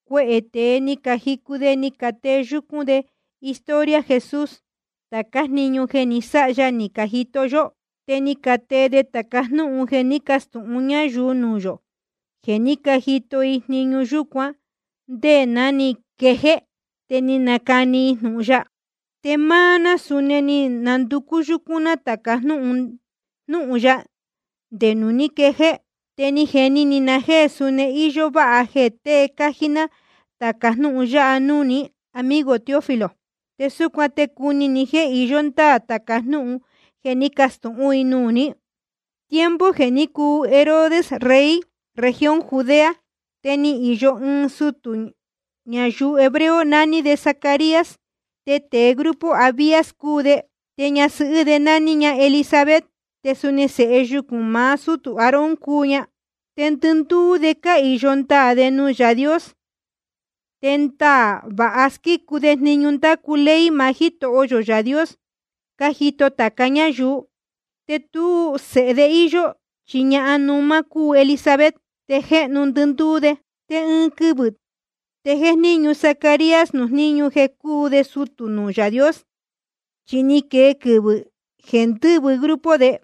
Cuehē tēe ni cajicu de ni catee yúcún de historia Jesús, tācá jniñu jeē ni sáha ya ni cajito yó. Te ni catee de tāca jnúhun jeē ní cacastūhun ñáyuu nuū yō, jeē ní cajito i jniñu yúcuan nde ná ni quejéé, te ni canacani i jnūhun ya. Te máá ná, suni ni nanducú yúcún ná tāca jnúhun ya, nde nuū ní quejéé. Te ni jeni ni na jéē suni íyó váha jeē tée cájí ná tāca jnúhun yáha núū ní, amigo Teófilo. Te súcuan te cuni ni jéē iyó ndáā tāca jnúhun jeē ní cacastūhún i nuū ní. Tiempo jeē ní cuu Herodes rey región Judea, te ni īyo ɨɨn sutū ñayuu hebreo, naní de Zacarías, te grupo Abías cúu de. Te ñasɨhɨ́ de nání ña Elisabet, te suni sēhe yucūn maá sútū Aarón cúu ña. Te ndɨndúú de cahīyo ndaā de nuū Yaā Dios, te ndaā vāha cásquícu de jniñu ndácu ley maá Jítoho yō Yaā Dios, cájito tāca ñáyuu. Te tú sēhe de íyó, chi ñahan númá cúu Elisabet, te je jéhnu ndɨndúú de. Te ɨɨn quɨvɨ̄ te jéjníñu Zacarías nuū jníñu jeē cúu de sutū nuū Yaā Dios, chi ni quee quɨvɨ̄ jeē ndɨ́vɨ grupo de.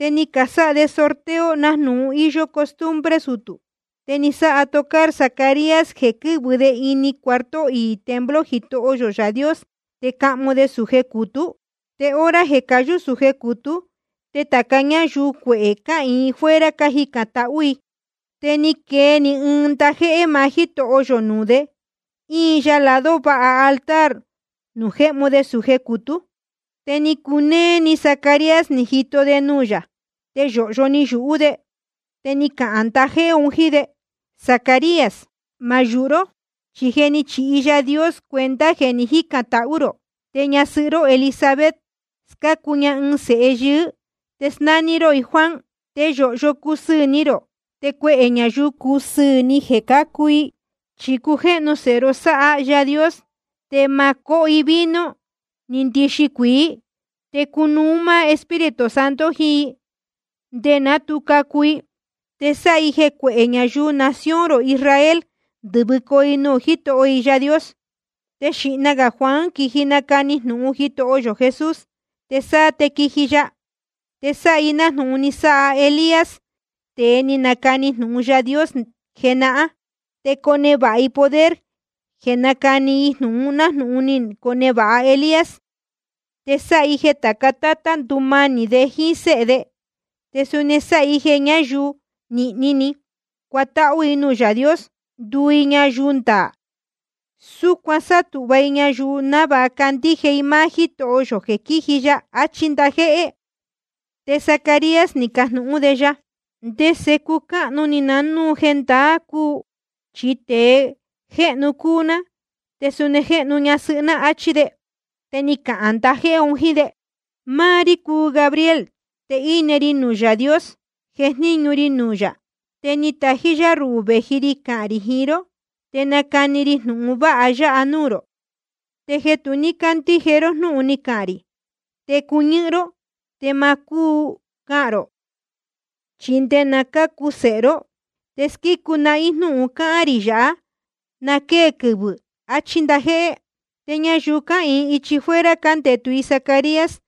Te ni casáha de sorteo, nájnūhun íyó costumbre sutū. Te ni sáha tocar Zacarías jeē quɨ́vɨ de ini cuarto iī templo Jitoho yō Yaā Dios, te cahmu de sūje cūtú. Te hora jeē cayú sūje cūtú, te tāca ñáyuu cuehē cáhīin i fuera, cájicān tahú i. Te ni cane ɨɨn ndajéhé maá Jítoho yō nuū de, íin ya lado váha altar nuū jéhmu de sūje cūtú. Te ni cunéé ni Zacarías ni jito de nuū yā, te yōhyo ni yūhú de. Te ni cahān ndajéhé un jíín de: Zacarías, ma yūhu ró, chi je ni chihi Yaā Dios cuenta jeē ni jícān tahú rō. Te ñasɨhɨ́ ró Elisabet, scácu ña ɨɨn sēhe yɨɨ́, te snání ró i Juan. Te yōhyo cusɨɨ̄ ni rō. Te cuehē ñayuu cusɨɨ̄ ni jeē cácu i. Chi cujéhnu sēhe ró sáha máá Yaā Dios. Te ma cóho i vino ni ndixi cuīí. Te cunuú máá Espíritu Santo jiín i, nde ná tu cacu i. Te sáha i jeē cuehē ñayuu nación rō Israel ndɨ̄vɨcoo i nuū Jítoho i Yaā Dios. Te xīhna gā Juan quiji nacani jnūhun Jitoho yō Jesús, te sáá te quiji ya. Te sáha i nájnūhun ni sáha Elías, tēe ni nacani jnūhun Yaā Dios jenahán, te conevāha i poder jeē nácani i jnūhun, nájnūhun ni conevāha Elías. Te sáha i jeē tāca tátá ndumanī de jíín séhe de. Te suni sáha i jeē ñáyuu nīhni ni cuatáhú i nuū Yaā Dios, nduu i ñayuu ndaā. Súcuan sátūhva i ñayuu návāha candíje i máá Jítoho yō jeē quíji ya. Achí ndajéhé. Te Zacarías ni cajnūhún de ya: ¿Ndese cucáhnu ni na núu jendaá cúu? Chi tēe jéhnu cúu ná, te suni jéhnu ñasɨhɨ́ ná, áchí de. Te ni cahān ndajéhé un jíín de: Máá rí cúu Gabriel, te íne ri nuū Yaā Dios, jejníñu ri nuū yā. Te ni tají yá ruhū vēji ri cahān rī jiín ró, te nácani ri jnūhun vāha yáha núū rō. Te jeē tu ní cándíje ró jnúhun ni cahān rī, te cuñɨ́hɨ́n ró, te ma cúu cahān rō, chi nde na cácu sēhe ró. Te squícu nahín jnúhun cáhán rī yāhá, na quée quɨvɨ̄, achí ndajéhé. Te ñayuu cáhīin ichi fuera, cándetu i Zacarías,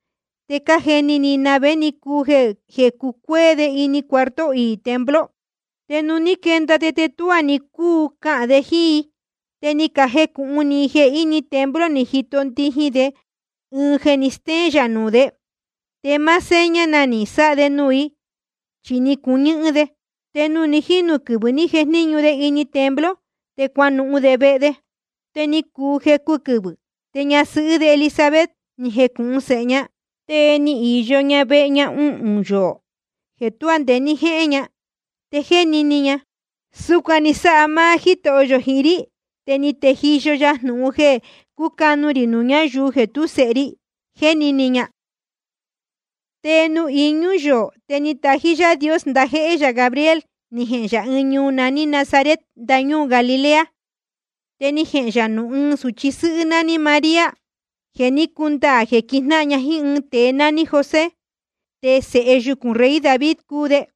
te cájeni ni i na vé ni cuu jeē cucuéé de ini cuarto iī templo. Te nuū ní quenda de, te tuá ni cúu cahān de jíín i. Te ni cajecūhun ni i jeē ini templo ni jito ndijin de ɨɨn jeē ni stéén yā nuū de. Te máá seña na ni sáha de nuū i, chi ni cuñɨ́hɨ́n de. Te nuū ni jínu quɨvɨ̄ ni jejníñu de ini templo, te cuanuhun de vehe de. Te ni cuu jecu quɨvɨ̄, te ñasɨhɨ́ de Elisabet ni jecūhun sēhe ña. Te ni īyo ña vehe ña uhūn yoō jeē tuá nde ní jéhén ña. Te jéni ni ña: Súcuan ni sáha máá Jítoho yō jiín rí, te ni tejiyo ya jnūhun jeē cúcanu rī nuū ñáyuu jeē tú sēhe ri, jéni ni ña. Te nuū iñú yoō, te ni tají Yaā Dios ndajéhé yā Gabriel, ni jehēn yā ɨɨn ñuu naní Nazaret, ndañúū Galilea. Te ni jehēn yā nuū ɨɨn sūchi sɨ́hɨ́ nání María. Te je ni cundaā jeē quijnáhan ña jíín ɨɨn tēe nání José, te sēhe yucūn rey David cúu de.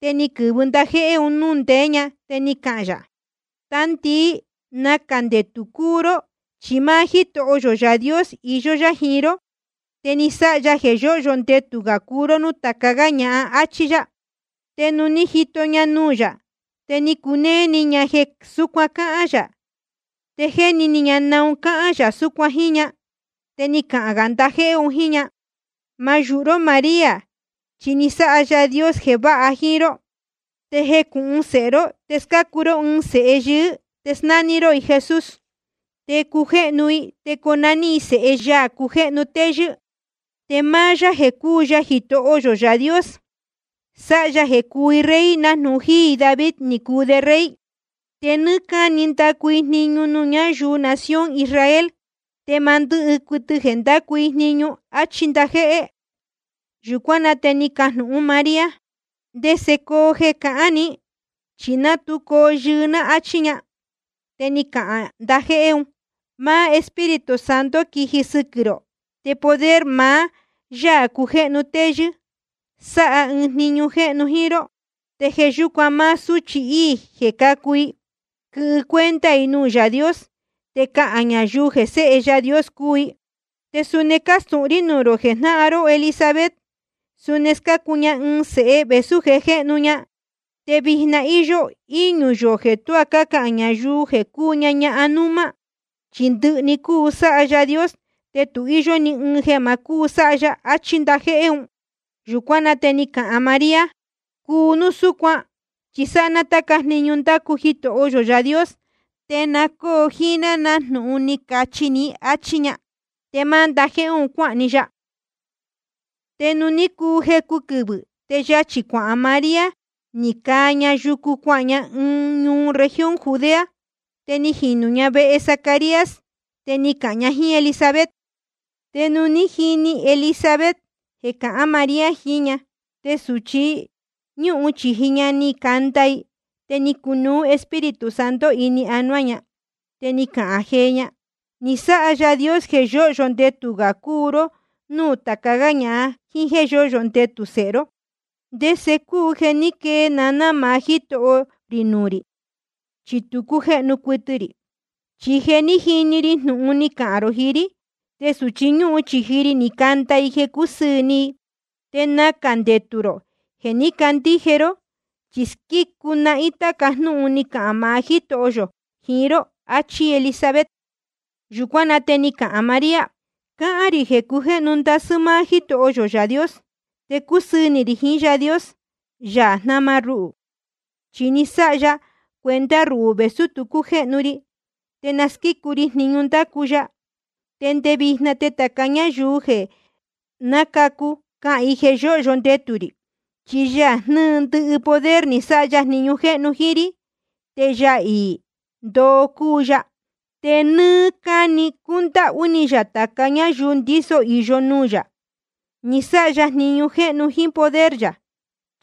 Te ni quɨ̄vɨ ndajéhé un núū ndeé ña, te ni cahān yā: Tandii, nacā ndetū cúu ró. Chi máá Jítoho yō Yaā Dios iyó yá jiín ró, te ni sáha ya jeē yóhyo ndetū gā cúu ró núū tāca gá ñahan, áchí yá. Te nuū ni jíto ña nuū yā, te ni cunéé ni ña jeē súcuan cáhán yā, te jéni ni ña naun cáhán yā súcuan jíín ña. Te ni cahān gā ndajéhé un jíín ña: Ma yūhu ró María, chi ni sáha Yaā Dios jeē váha jíín ró. Te jecūhun sēhe ró te scácu ró ɨɨn sēhe yɨɨ́, te snání ró i Jesús. Te cujéhnu i, te conaní i Sēhe Yaā cujéhnu téyɨ́. Te máá yá jeē cúu ya Jitoho yō Yaā Dios, sáha ya jeē cuu i rey, nájnūhun jíí i David ni cuu de rey. Te nɨ́ɨ́ cáni ndacu i jniñu nuū ñáyuu nación Israel. Te ma ndɨ́hɨ cuɨtɨ jeē ndácu i jniñu. Achí ndajéhé. Yūcuán na te ni cajnūhún María: ¿Ndese coo jeē ni cáhān ní? Chi ná tu coo yɨɨ ná, áchí ña. Te ni cahān ndajéhé un: Máá Espíritu Santo quiji sɨquɨ̄ rō, te poder maá Yaā cujéhnu téyɨ́ sáha ɨɨn jniñu jéhnu jíín ró. Te jeē yúcuan máá súchi íī jeē cácu, quɨhɨ cuenta i nuū Yaā Dios, te cahān ñayuu jeē Séhe Yaā Dios cúu i. Te suni cástūhun rí nuū rō jeē jnáhan ró Elisabet, suni scácu ña ɨɨn sēhe vēsú je jéhnu ña. Te vijna íyó íñū yoō jeē tuá cácahān ñayuu jeē cúu ña ñahan númá. Chi ndɨhɨ‑ni cuu sáha Yaā Dios, te tu íyó ni ɨɨn jeē ma cúu sáha ya, achí ndajéhé un. Yūcuán na te ni cahān María: Cuu núu súcuan, chi sáha ná táca jniñu ndácu Jitoho yō Yaā Dios, te na cóo jíín ná nájnūhun ni cachi ní, áchí ña. Te máá ndajéhé un cuáhān‑ni ya. Te ni cuu jecu quɨvɨ̄, te yachī cuahān María, ni caa ña yucu cuahān ña ɨɨn ñuu región Judea. Te ni jinū ña vehe Zacarías, te ni cahān ña jíín Elisabet. Te nuū ní jini Elisabet jeē cahán María jiín ña, te sūchi ñúhun chīji ña ni canda‑ni i. Te ni cunuú Espíritu Santo ini anuá ña. Te ni cahān jee ña: Ni sáha Yaā Dios jeē yóhyo ndetū gā cúu ró núū tāca gá ñahan, jíín jéē yóhyo ndetū sēhe ró. ¿Te ndese cúu jeē ní quee naná maá Jítoho rī nuū rī? Chi tu cújéhnu cuɨtɨ rī. Chi jeē ní jini‑ni ri jnūhun ni cahān rō jiín rí, te sūchi ñúhun chīji ri ni canda i jeē cúsɨɨ̄ ni i. Te nacā ndetū rō jeē ní candíje ró, chi squícu nahín tāca jnúhun ni cahān maá Jítoho yō jiín ró. Achí Elisabet. Yūcuán na te ni cahān María: Cáhán rī jeē cujéhnu ndasɨ́ máá Jítoho yō Yaā Dios, te cúsɨɨ̄ ni rī jiín Yaā Dios, Yaā jnáma ruhū. Chi ni sáha ya cuenta ruhū, vēsú tu cújéhnu ri. Te na squícu ri jniñu ndácu ya. Te nde vijna te tāca ñáyuu jeē nácacu, cahān i jeē yóhyo ndetū rī. Chi Yaā jnɨ́ɨ ndɨhɨ poder, ni sáha ya jniñu jéhnu jíín rí. Te Yaā iī ndoo cúu ya. Te nɨ́ɨ́ cáni cundáhú ni yā tāca ñáyuu ndíso īyo nuū yā. Ni sáha ya jniñu jéhnu jíín poder yā,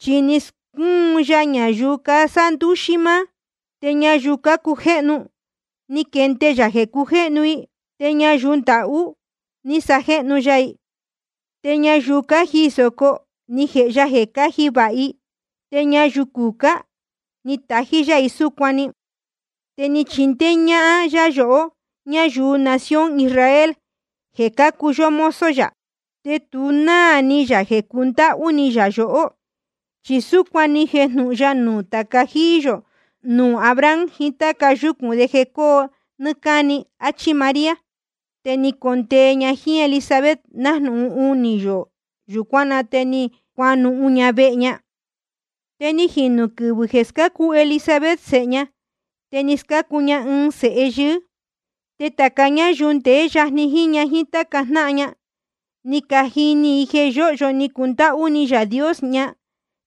chi ni scúnu ya ñayuu casándúxí máá, te ñayuu cácujéhnu, ni quende ya jeē cujéhnu i. Te ñayuu ndahú chi ni sajéhnu ya i, te ñayuu cájiī sōco ni jēhe ya jeē cáji vāha i. Te ñayuu cucá ní natají yá i súcuan‑ni. Te ni chindéé ñáhán yá yohó, ñáyuu nación Israel, jeē cácuu yó mozo yā, te tu náā ni yā jeē cundáhú ni yā yohó. Chi súcuan ni jejnūhun ya nuū tāca jíí yō, nuū Abraham jiín táca yúcūn de jeē cóo nɨ́ɨ́ cáni. Achí María. Te ni condee ña jíín Elisabet nájnūhun unī yoō. Yūcuán na te cuanuhun ña vehe ña. Te ni jinū quɨvɨ̄ jeē scácu Elisabet sēhe ña, te ni scácu ña ɨɨn sēhe yɨɨ́. Te tāca ñáyuu ndeé yajni jíín ña jíín táca jnáhan ña, ni cajini i jeē yóhyo ni cundáhú ni Yaā Dios ña,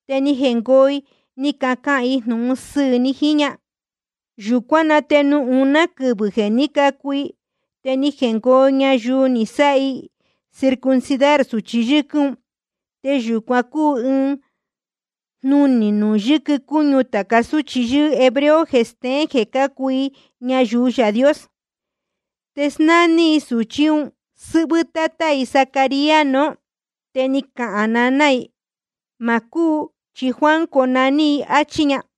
te ni jengoo i ni cacahān i jnūhun sɨɨ̄ ni jiín ña. Yūcuán na te nuū uná quɨvɨ̄ jeē ní cacu i, te ni jengoo ñayuu ni sáha i circuncidar sūchi yɨ́quɨ́n un. (Te yūcuan cúu ɨɨn jnunī nuū yɨquɨ cúñu tāca súchi yɨ́ɨ́ hebreo jeē steén jeē cácuu i ñayuu Yaā Dios.) Te snání i sūchí un sɨ́hvɨ́ tátá i Zacarías nuú. Te ni cahān naná i: Ma cúu, chi Juan conaní i, áchí ña.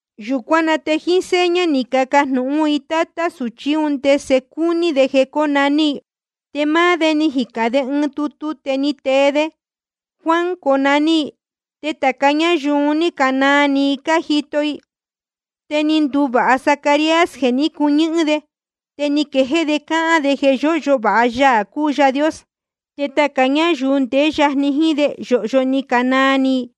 Yūcuán na te jíín seña ni cacajnūhún i tátá sūchí un ndese cúní de jeē cónaní i. Te máá de ni jicān ɨɨn tutu, te ni tee de: Juan conaní i. Te tāca ñáyuu un ní canaa ni i cájito i. Te ni nduvāha Zacarías jeē ní cuñɨ́hɨ́n de, te ni quejéé de cáhán de jeē yóhyo vāha Yaā cúu Yaā Dios. Te tāca ñáyuu ndeé yajni jíín de, yōhyo ni canaa ni i.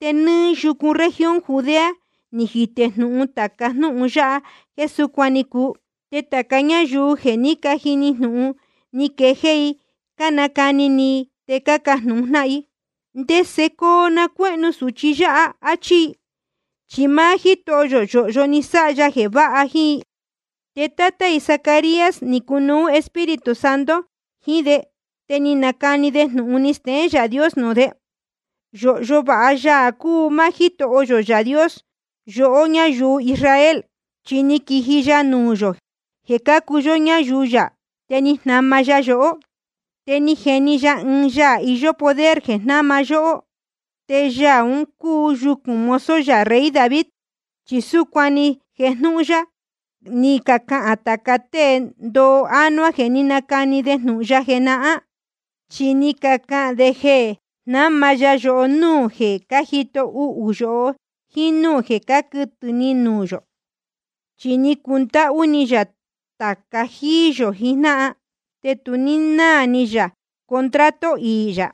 Te nɨ́ɨ́ yucu región Judea ni jitē núu tāca jnúhun yáha jeē súcuan ni cuu. Te tāca ñáyuu jeē ní cajini jnūhun, ni quejéé i cánacani ni i, te cácajnūhun jnáhan i: ¿Ndese coo na cuéhnu sūchi yáha? áchí i. Chi máá Jítoho yō yōhyo ni sáha ya jeē váha jíín i. Te tátá i Zacarías ni cunuú Espíritu Santo jiín de, te ni nacani de jnūhun ni steén Yaā Dios nuū de: Yōhyo vāha Yaā cúu máá Jítoho yō, Yaā Dios yohó ñáyuu Israel, chi ni quiji ya nuū yō jeē cácuu yó ñáyuu yā, te ni jnama ya yohó. Te ni jeni ya ɨɨn Yaā iyó poder jeē jnáma ya yohó, te Yaā ún cacu yucūn mozo yā rey David. Chi súcuan ni jejnūhun ya, ni cacahān tāca tée ndoo ánuá jeē ní canacani de jnūhun ya jenahán. Chi ni cacahān de jeē jnáma ya yohó núū jeē cájito uhū yohó, jíín núū jeē cáquɨtɨ̄ ni nuū yō. Chi ni cundáhú ni yā tāca jíí yō jijnáhan, te tu ní náā ni yā contrato iī yā.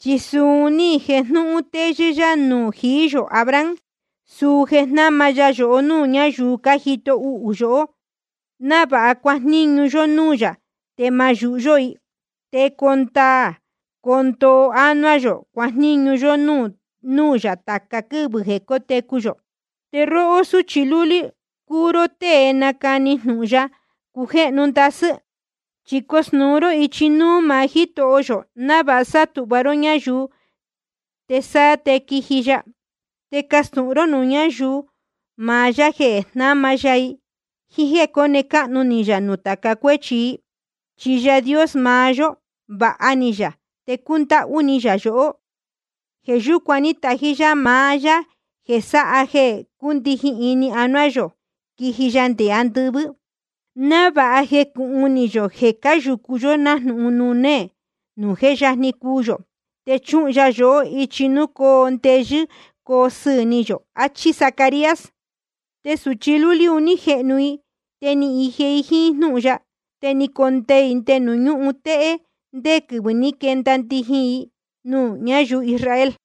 Chi suu un ní jejnūhun téyɨ́ yá nuū jií yō Abraham, suu jeē jnáma ya yohó núū ñáyuu cájito uhū yohó, návāha cuajníñu yó núū yā, te ma yūhu yó i. Te coo ndaā coo ndoo ánuá yō, cuajníñu yó núū yā tāca quɨ́vɨ jeē cótecu yō. Te róhó súchi lúlí, cuu ró tée nacani jnūhun Yaā cujéhnu téyɨ́. Chi cosnūu ró ichi núú maá Jítoho yō, návāha sátūhva ró ñáyuu, te sáá te quiji ya. Te castūhun ró nuū ñáyuu maá yá jeē jnáma ya i, jíín jéē cóne cáhnu ni yā nuū tāca cuéchi i. Chi Yaā Dios maá yó, vāha ni yā te cúndáhú ni yā yohó. Jeē yúcuan tají yá maá Yaā jeē sáha jeē cúndijin ini anuá yō, quiji ya nde andɨvɨ́, návāha jecūhun ni yohó jéē cáyūcu nájnūhun nuū néē nuū jé yajni cuu yō. Te chuhun ya yohó ichi nuū cóo ndeyɨ́ coo sɨɨ̄ ni yō. Achí Zacarías. Te sūchi lúlí un ní jehnu i te ni ije i jíín jnúhun ya. Te ni condee i nde nuū ñúhun téhé ndé quɨvɨ̄ ní quenda ndijin i nuū ñáyuu Israel.